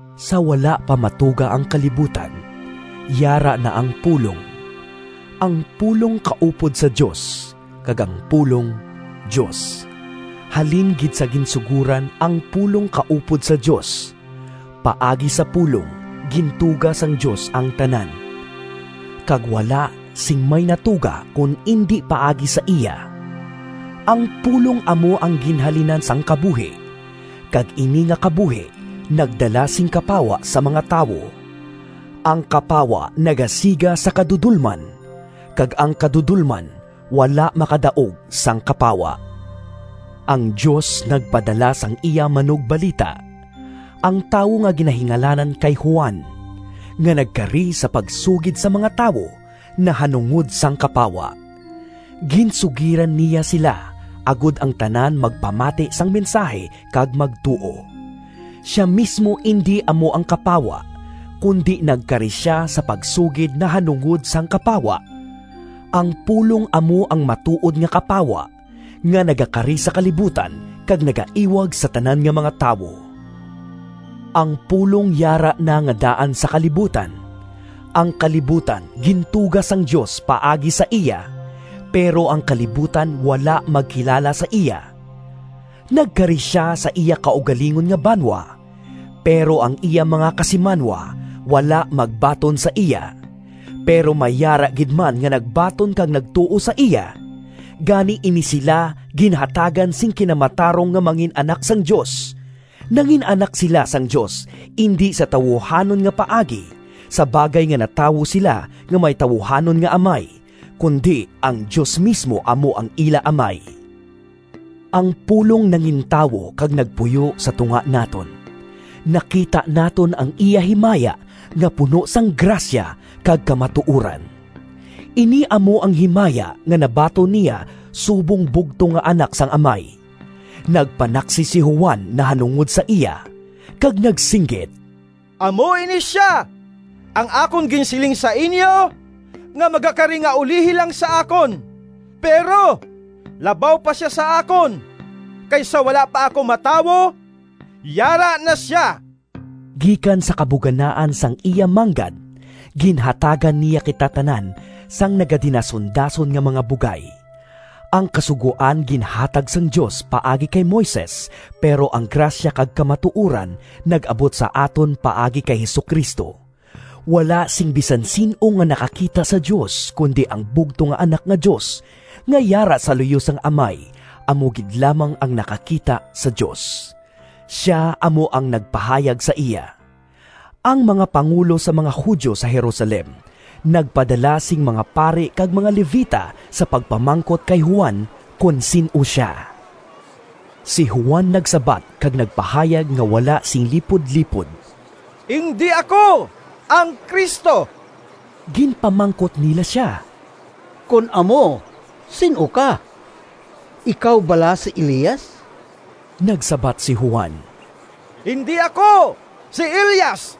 Sa wala pa matuga ang kalibutan, yara na ang Pulong. Ang Pulong kaupod sa Dios, kag ang Pulong Dios. Halin gid sa ginsugoran ang Pulong kaupod sa Dios. Paagi sa Pulong gintuga sang Dios ang tanan, kag wala sing may natuga kon indi paagi sa iya. Ang Pulong amo ang ginhalinan sang kabuhi, kag ini nga kabuhi nagdala sing kapawa sa mga tawo. Ang kapawa nagasiga sa kadudolman, kag ang kadudolman wala makadaog sang kapawa. Ang Dios nagpadala sang iya manugbalita, ang tawo nga ginahingalanan kay Juan, nga nagkari sa pagsugid sa mga tawo nahanungod sang kapawa. Ginsugiran niya sila agod ang tanan magpamati sang mensahi, kag magtuo. Sia mismo indi amo ang kapawa, kundi nagkari sia sa pagsugid nahanungod sang kapawa. Ang Pulong amo ang matuod nga kapawa nga nagakari sa kalibutan kag nagaiwag sa tanan nga mga tawo. Ang Pulong yara na nga daan sa kalibutan. Ang kalibutan gintuga sang Dios paagi sa iya, pero ang kalibutan wala magkilala sa iya. Nagkari sia sa iya kaugalingon nga banwa, pero ang iya mga kasimanwa wala magbaton sa iya. Pero may yara gid man nga nagbaton kag nagtuo sa iya. Gani ini sila ginhatagan sing kinamatarong nga mangin-anak sang Dios. Nangin-anak sila sang Dios indi sa tawuhanon nga paagi sa bagay nga natawo sila nga may tawuhanon nga amay, kundi ang Dios mismo amo ang ila Amay. Ang Pulong nangintawo kag nagpuyo sa tunga naton. Nakita naton ang iya himaya nga puno sang grasya kag kamatuoran; ini amo ang himaya nga nabaton niya subong bugtong nga Anak sang Amay. Nagpanaksi si Juan nahanungod sa iya, kag nagsinggit, “Amo ini sia ang akon ginsiling sa inyo nga magakari nga ulihi lang sa akon, pero labaw pa sia sa akon, kay sa wala pa ako matawo, yara na sia!” Gikan sa kabuganaan sang iya manggad ginhatagan niya kita tanan sang nagadinasundason nga mga bugay. Ang Kasugoan ginhatag sang Dios paagi kay Moises, pero ang grasya kag kamatuoran nag-abot sa aton paagi kay Jesu-Cristo. Wala sing bisan sin-o nga nakakita sa Dios, kundi ang bugtong nga Anak nga Dios, nga yara sa luyo sang Amay, amo gid lamang ang nakakita sa Dios. Sia amo ang nagpahayag sa iya. Ang mga pangulo sang mga Judio sa Jerusalem nagpadala sing mga pari kag mga Levita sa pagpamangkot kay Juan kon sin-o sia. Si Juan nagsabat kag nagpahayag nga wala sing lipudlipod, “Indi ako ang Cristo.” Ginpamangkot nila sia, “Kon amo, sin-o ka? Ikaw bala si Elias?” Nagsabat si Juan, “Indi ako si Elias.”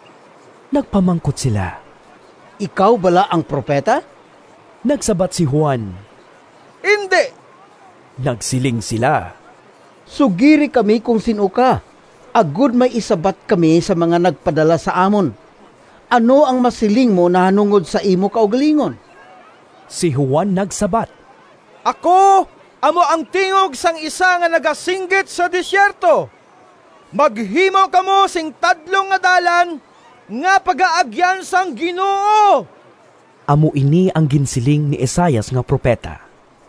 Nagpamangkot sila, “Ikaw bala ang Propeta?” Nagsabat si Juan, “Indi.” Nagsiling sila, “Sugiri kami kon sin-o ka agod may isabat kami sa mga nagpadala sa amon. Ano ang masiling mo nahanungod sa imo kaugalingon?” Si Juan nagsabat: “Ako amo ‘ang tingog sang isa Nga nagasinggit sa desierto: Maghimo kamo sing tadlong nga dalan Nga pagaagyan sang Ginoo!’” (Amo ini ang ginsiling ni Isaias nga propeta.)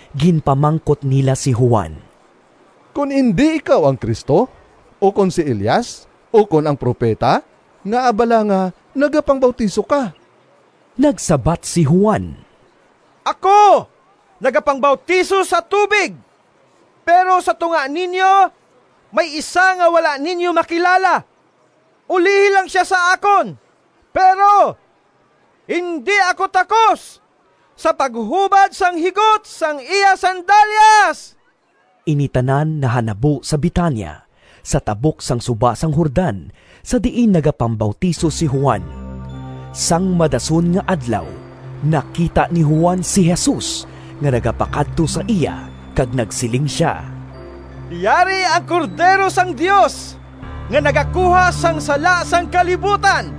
Ginpamangkot nila si Juan, “Kon indi ikaw ang Cristo, ukon si Elias ukon ang Propeta, ngaa bala nga nagapangbautiso ka?” Nagsabat si Juan, “Ako nagapangbautiso sa tubig, pero sa tunga ninyo may isa nga wala ninyo makilala. Ulihi lang sia sa akon, pero indi ako takos sa paghubad sang higot sang iya sandalyas.” Ini tanan nahanabo sa Betania, sa tabok sang suba sang Jordan sa diin nagapangbautiso si Juan. Sang madason nga adlaw, nakita ni Juan si Jesus nga nagapakadto sa iya kag nagsiling sia, “Yari ang Cordero sang Dios nga nagakuha sang sala sang kalibutan!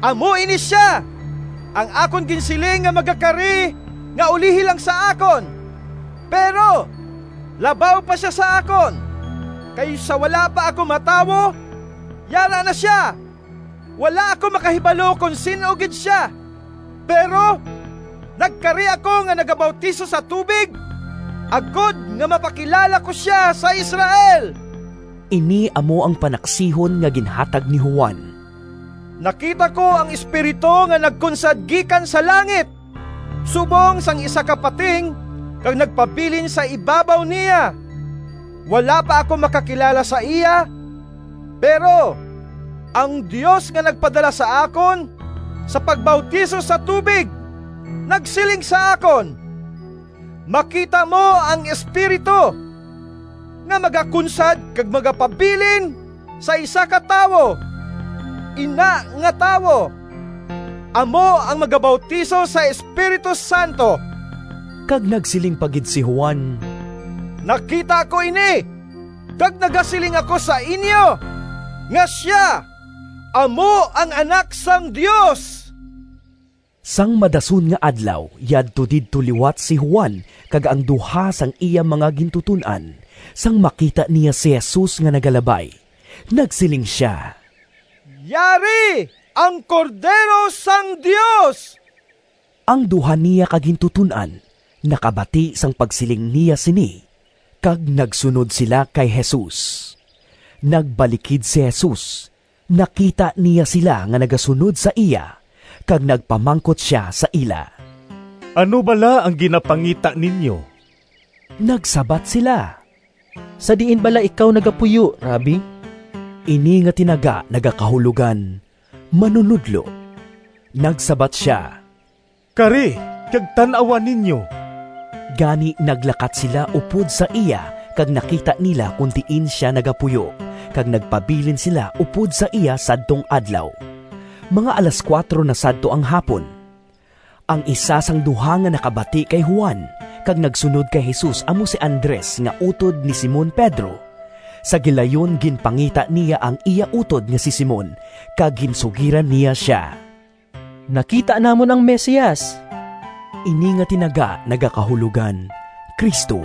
Amo ini sia ang akon ginsiling nga magakari nga ulihi lang sa akon, pero labaw pa sia sa akon, kay sa wala pa ako matawo, yara na sia. Wala ako makahibalo kon sin-o gid sia, pero nagkari ako nga nagabautiso sa tubig agod nga mapakilala ko sia sa Israel.” Ini amo ang panaksihon nga ginhatag ni Juan, “Nakita ko ang Espiritu nga nagkunsad gikan sa langit subong sang isa ka pating, kag nagpabilin sa ibabaw niya. Wala pa ako makakilala sa iya, pero ang Dios nga nagpadala sa akon sa pagbautiso sa tubig, nagsiling sa akon, ‘Makita mo ang Espiritu nga magakunsad kag magapabilin sa isa ka tawo. Ina nga tawo amo ang magabautiso sa Espiritu Santo.’” Kag nagsiling pa gid si Juan, “Nakita ko ini kag nagasiling ako sa inyo, nga sia amo ang Anak sang Dios.” Sang madason nga adlaw, yadto didto liwat si Juan kag ang duha sang iya mga gintuton-an, sang makita niya si Jesus nga nagalabay. Nagsiling sia, “Yari ang Cordero sang Dios!” Ang duha niya ka gintuton-an nakabati sang pagsiling niya sini, kag nagsunod sila kay Jesus. Nagbalikid si Jesus, nakita niya sila nga nagasunod sa iya, kag nagpamangkot sia sa ila, “Ano bala ang ginapangita ninyo?” Nagsabat sila, “Sa diin bala ikaw nagapuyo, Rabbi?” (Ini nga tinaga nagakahulogan “Manunodlo.”) Nagsabat sia, “Kari kag tan-awa ninyo.” Gani naglakat sila upod sa iya kag nakita nila kon diin sia nagapuyo, kag nagpabilin sila upod sa iya sadtong adlaw. (Mga alas kuwatro na sadto ang hapon.) Ang isa sang duha nga nakabati kay Juan kag nagsunod kay Jesus amo si Andres nga utod ni Simon Pedro. Sa gilayon ginpangita niya ang iya utod nga si Simon kag ginsugiran niya sia, “Nakita namon ang Mesias.” (Ini nga tinaga nagakahulogan “Cristo.”)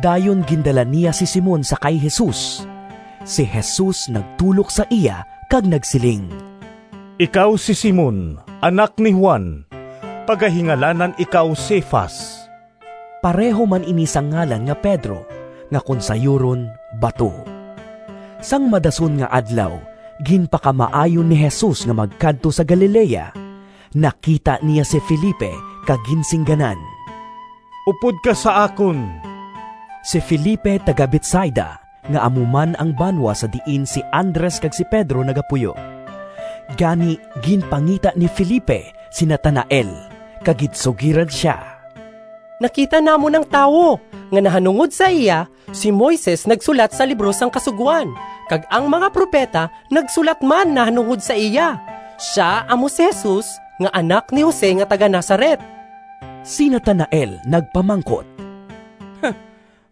Dayon gindala niya si Simon sa kay Jesus. Si Jesus nagtulok sa iya kag nagsiling, “Ikaw si Simon, anak ni Juan. Pagahingalanan ikaw Cefas.” (Pareho man ini sang ngalan nga Pedro nga kon sayuron “Bato.”) Sang madason nga adlaw, ginpakamaayo ni Jesus nga magkadto sa Galilea. Nakita niya si Felipe kag ginsingganan, “Upod ka sa akon!” (Si Felipe taga-Betsaida, nga amo man ang banwa sa diin si Andres kag si Pedro nagapuyo.) Gani, ginpangita ni Felipe si Natanael, kag ginsugiran sia, “Nakita namon ang tawo nga nahanungod sa iya si Moises nagsulat sa libro sang Kasugoan, kag ang mga propeta nagsulat man nahanungod sa iya. Sia amo si Jesus nga anak ni Jose nga taga-Nazaret.” Si Natanael nagpamangkot,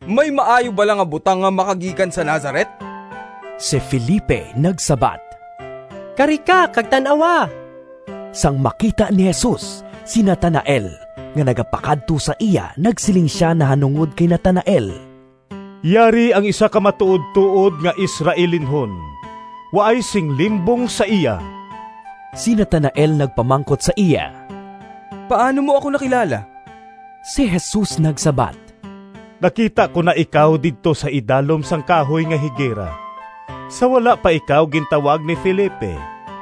“May maayo bala nga butang nga makagikan sa Nazaret?” Si Felipe nagsabat, “Kari ka kag tan-awa.” Sang makita ni Jesus si Natanael nga nagapakadto sa iya nagsiling sia nahanungod kay Natanael, “Yari ang isa ka matuodtuod nga Israelinhon; waay sing limbong sa iya!” Si Natanael nagpamangkot sa iya, “Paano mo ako nakilala?” Si Jesus nagsabat, “Nakita ko na ikaw didto sa idalom sang kahoy nga higera, sa wala pa ikaw gintawag ni Felipe.”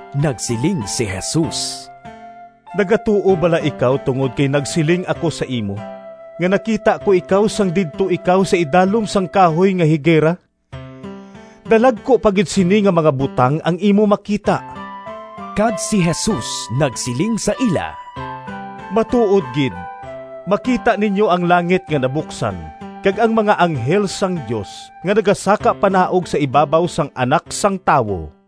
Nagsiling si Jesus, “Nagatuo bala ikaw tungod kay nagsiling ako sa imo nga nakita ko ikaw sang didto ikaw sa idalom sang kahoy nga higera? Dalagku pa gid sini nga mga butang ang imo makita!” Kag si Jesus nagsiling sa ila, “Matuod gid, makita ninyo ang langit nga nabuksan kag ang mga anghel sang Dios nga nagasakapanaog sa ibabaw sang Anak sang Tawo!”